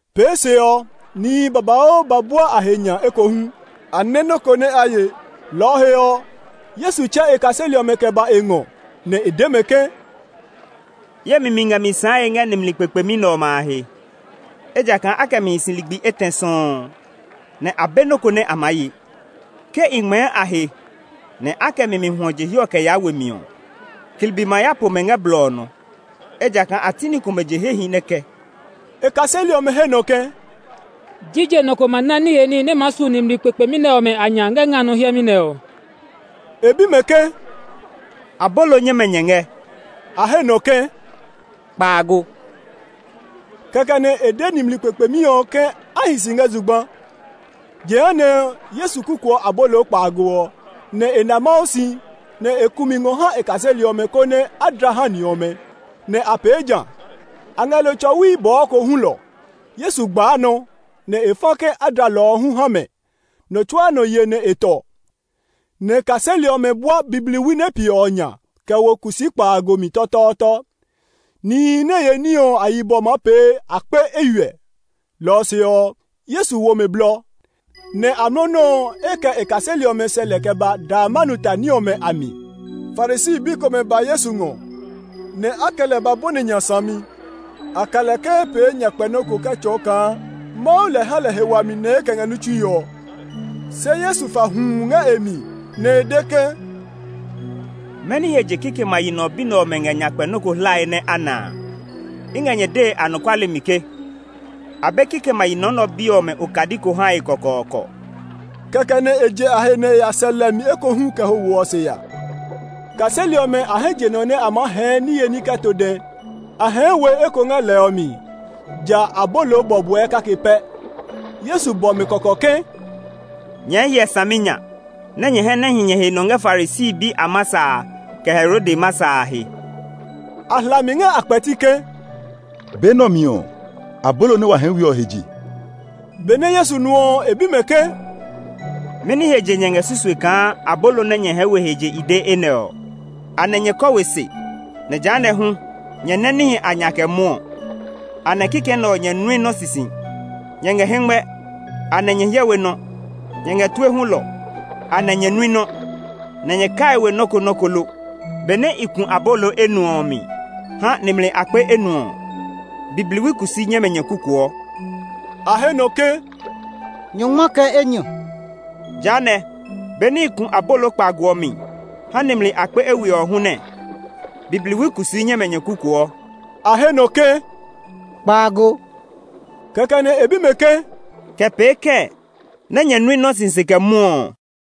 Pee se ɔ, nihi babauu ba bua a he nya ekohu. A nɛ́ nɔ́ ko nɛ a ye; lɔ ɔ he ɔ, Yesu tsɛ e kaseli ɔmɛ kɛ ba e ngɔ, nɛ e de mɛ ke, “Ye mi mi ngɛ mi sããe ngɛ nimli kpekpemi nɛ ɔmɛ a he, ejakaa a kɛ mi hi si ligbi etɛ sɔuu, nɛ a be nɔ́ ko nɛ a maa ye. Ke i ngmɛɛ a he nɛ a kɛ mi mi hwɔ je hiɛ ɔ kɛ yaa we mi ɔ, klibi ma ya po mɛ ngɛ blɔ ɔ nɔ, ejakaa a ti ni komɛ je hehi nɛ kɛ.” E kaseli ɔmɛ he nɔ ke, “Jije nɔ ko ma ná niye ní nɛ maa su nimli kpekpemi nɛ ɔmɛ a nya ngɛ nga nɔ hiɛmɛ nɛ ɔ?” E bi mɛ ke, “Abolo nyɛmɛ nyɛ ngɛ?” A he nɔ ke, “Kpaago.” Kɛkɛ nɛ e de nimli kpekpemi ɔ ke a hi si ngɛ zugba. Jehanɛ Yesu kukuɔ abolo kpaago ɔ, nɛ e na Mawu si, nɛ e ku mi ngɔ ha e kaseli ɔmɛ konɛ a dla ha ni ɔmɛ. Nɛ a pee ja. A ngɛ lo tsɔwi bɔɔ ko hulɔ. Yesu gbaa nɔ, nɛ e fa ke a dla lɔ ɔ hu ha mɛ. Nɔ tsuaa nɔ ye nɛ e tɔ, nɛ kaseli ɔmɛ bua bibliwi nɛ piɛ ɔ nya kɛ wo kusii kpaago mi tɔtɔɔtɔ. Nihi nɛ ye ní ɔ a yibɔ maa pee akpe eywiɛ. Lɔ ɔ se ɔ, Yesu wo mɛ blɔ, nɛ amlɔ nɔuu e kɛ e kaseli ɔmɛ sɛ lɛ kɛ ba Dalmanuta ní ɔmɛ a mi. Farisi bi komɛ ba Yesu ngɔ, nɛ a kɛ lɛ ba bɔni nya sami. A ka lɛ ke e pee nyakpɛ nɔ́ ko kɛ tsɔɔ kaa Mawu lɛ ha lɛ he wami nɛ e kɛ ngɛ ní tsue ɔ. Se Yesu fa huu ngɛ e mi, nɛ e de ke, “Mɛni he je kikɛmɛ a yi nɔ nɛ ɔ bi ɔmɛ ngɛ nyakpɛ nɔ́ ko hlae nɛ a na a? I ngɛ nyɛ dee anɔkuale mi ke, a be kikɛmɛ a yi nɔ nɛ ɔ bi ɔmɛ okadi ko hae kɔkɔɔkɔ!” Kɛkɛ nɛ e je a he nɛ e ya sɛ lɛ mi ekohu kɛ ho wo ɔ se ya. Kaseli ɔmɛ a hɛ je nɔ nɛ a maa hɛɛ niye ní kɛ to dɛ; a hɛɛ we eko ngɛ lɛ ɔ mi, ja abolo bɔbɔɛ kake pɛ. Yesu bɔ mɛ kɔkɔ ke, “Nyɛɛ hyɛ saminya nɛ nyɛ hɛ nɛ hi nyɛ he nɔ ngɛ Farisi bi a masa a, kɛ Herode masa a he!” A hla mi ngɛ a kpɛti ke, “Be nɛ ɔ mi ɔ, abolo nɛ wa hɛɛ we ɔ he je.” Benɛ Yesu nu ɔ, e bi mɛ ke, “Mɛni he je nyɛ ngɛ susue kaa abolo nɛ nyɛ hɛɛ we ɔ he je i de enɛ ɔ? Anɛ nyɛ kɔ we se, nɛ jehanɛ hu, nyɛ nɛ́ níhi a nya kɛ mwɔɔ? Anɛ kikɛ nɛ ɔ nyɛ nui nɔ sisi? Nyɛ ngɛ hɛngmɛ, anɛ nyɛ hyɛ we nɔ? Nyɛ ngɛ tue hulɔ, anɛ nyɛ nui nɔ́; nɛ nyɛ kaii we nɔ́ ko nɔ́ ko lo? Benɛ i ku abolo enuɔ ɔ mi ha nimli akpe enuɔ ɔ, bibliwi kusii nyɛmɛ nyɛ kukuɔ?” A he nɔ ke, “Nyɔngma kɛ enyɔ.” “Jehanɛ, be nɛ i ku abolo kpaago ɔ mi ha nimli akpe eywiɛ ɔ hu nɛɛ; bibliwi kusii nyɛmɛ nyɛ kukuɔ?” A he nɔ ke, “Kpaago.” Kɛkɛ nɛ e bi mɛ ke, “Kɛ pee kɛɛ nɛ nyɛ nui nɔ́ sisi kɛ mwɔɔ ɔ?”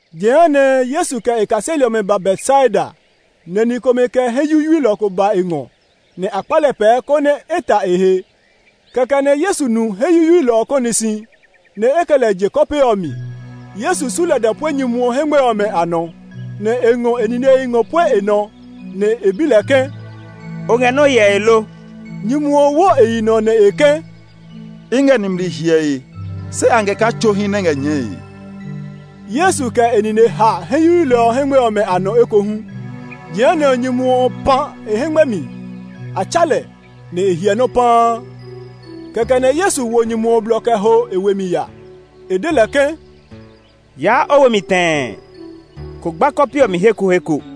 Jehanɛ Yesu kɛ e kaseli ɔmɛ ba Betsaida; nɛ ni komɛ kɛ hɛ yuyuilɔ ko ba e ngɔ, nɛ a kpa lɛ pɛɛ konɛ e ta e he. Kɛkɛ nɛ Yesu nu hɛ yuyuilɔ ɔ kɔni si, nɛ e kɛ lɛ je kɔpe ɔ mi. Yesu su lada pue nyumu ɔ hɛngmɛ ɔmɛ a nɔ, nɛ e ngɔ e ninehi ngɔ pue e nɔ; nɛ e bi lɛ ke, “O ngɛ nɔ hyɛe lo?” Nyumu ɔ wo e yi nɔ nɛ e ke, “I ngɛ nimli hyɛe, se a ngɛ kaa tsohi nɛ ngɛ nyɛɛe.” Yesu kɛ e nine ha hɛ yuyuilɔ ɔ hɛngmɛ ɔmɛ nɔ ekohu. Jehanɛ nyumu ɔ pã e hɛngmɛ mi; a tsa lɛ, nɛ e hyɛ nɔ́ paa. Kɛkɛ nɛ Yesu wo nyumu ɔ blɔ kɛ ho e we mi ya. E de lɛ ke, “Yaa o we mi tɛɛ; kó gba kɔpe ɔ mi he ko he ko!”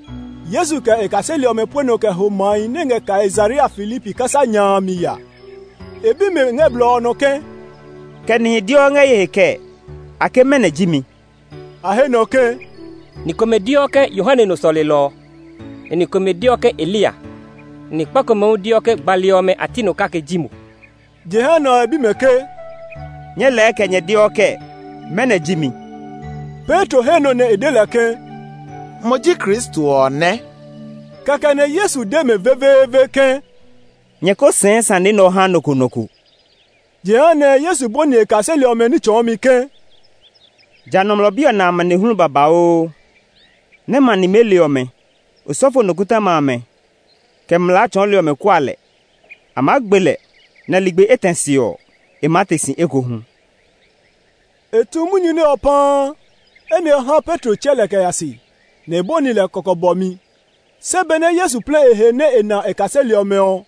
Yesu kɛ e kaseli ɔmɛ pue nɔ kɛ ho mahi nɛ ngɛ Kaisarea Filipi kasa nya a a mi ya. E bi mɛ ngɛ blɔ ɔ nɔ ke, “Kɛ nihi deɔ ngɛ ye he kɛɛ? A ke mɛnɔ ji mi?” A he nɔ ke, “Ni komɛ deɔ ke, Yohane nɔ sɔlelɔ ɔ. Ni komɛ deɔ ke Eliya, nɛ ni kpa komɛ hu deɔ ke gbali ɔmɛ a ti nɔ kake ji mo.” Jehanɛ e bi mɛ ke, “Nyɛɛ lɛɛ kɛ nyɛ deɔ kɛɛ? Mɛnɔ ji mi?” Petro he nɔ nɛ e de lɛ ke, “Mo ji Kristo ɔ nɛ!” Kɛkɛ nɛ Yesu de mɛ veveeve ke, “Nyɛ ko sɛɛ sane nɛ ɔ ha nɔ ko nɔ ko.” Jehanɛ Yesu bɔni e kaseli ɔmɛ ní tsɔɔmi ke, “Ja Nɔmlɔ Bi ɔ na amanehlu babauu, nɛ́ ma nimeli ɔmɛ, osɔfo nikɔtɔma amɛ, kɛ mlaa tsɔɔli ɔmɛ kua lɛ. A maa gbe lɛ, nɛ ligbi etɛ se ɔ, e maa te si ekohu.” E tu munyu nɛ ɔ paa. Enɛ ɔ ha Petro tsɛ lɛ kɛ ya se, nɛ e bɔni lɛ kɔkɔ bɔmi. Se benɛ Yesu plɛ e he nɛ e na e kaseli ɔmɛ ɔ,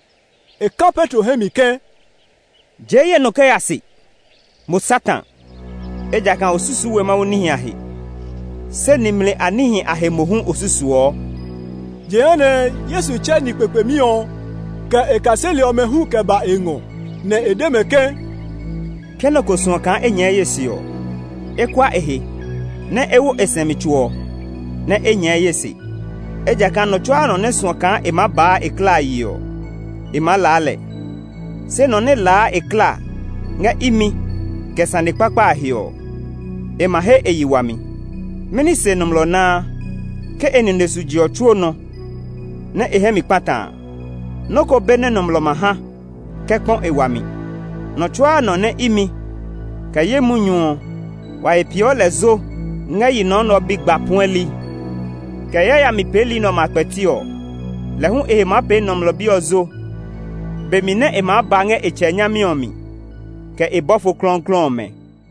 e ka Petro hɛ mi ke, “Jee ye nɔ kɛ ya se, mo Satan! Ejakaa o susuu we Mawu níhi a he, se nimli a níhi a he mohu o susuɔ!” Jehanɛ Yesu tsɛ ni kpekpemi ɔ, kɛ e kaseli ɔmɛ hu kɛ ba e ngɔ, nɛ e de mɛ ke, “Ke nɔ ko suɔ kaa e nyɛɛ ye se ɔ, e kua e he, nɛ e wo e sɛumi tso ɔ, nɛ e nyɛɛ ye se. Ejakaa nɔ tsuaa nɔ nɛ suɔ kaa e maa baa e klaa yi ɔ, e maa laa lɛ; se nɔ nɛ laa e klaa ngɛ imi, kɛ sane kpakpa a he ɔ, e ma he e yi wami. Mɛni se nɔmlɔ naa, ke e nine su je ɔ tsuo nɔ, nɛ e hɛ mi kpata a? Nɔ́ ko be nɛ nɔmlɔ ma ha kɛ kpɔ e wami. Nɔ tsuaa nɔ nɛ imi, kɛ ye munyu ɔ, wa he peeɔ lɛ zo ngɛ yi nɔ nɛ ɔ bi gba puɛli, kɛ yayami peeli nɛ ɔmɛ a kpɛti ɔ, lɛ hu e he maa pee Nɔmlɔ Bi ɔ zo be mi nɛ e maa ba ngɛ e Tsɛ nyami ɔ mi, kɛ e bɔfo klɔuklɔu ɔmɛ.”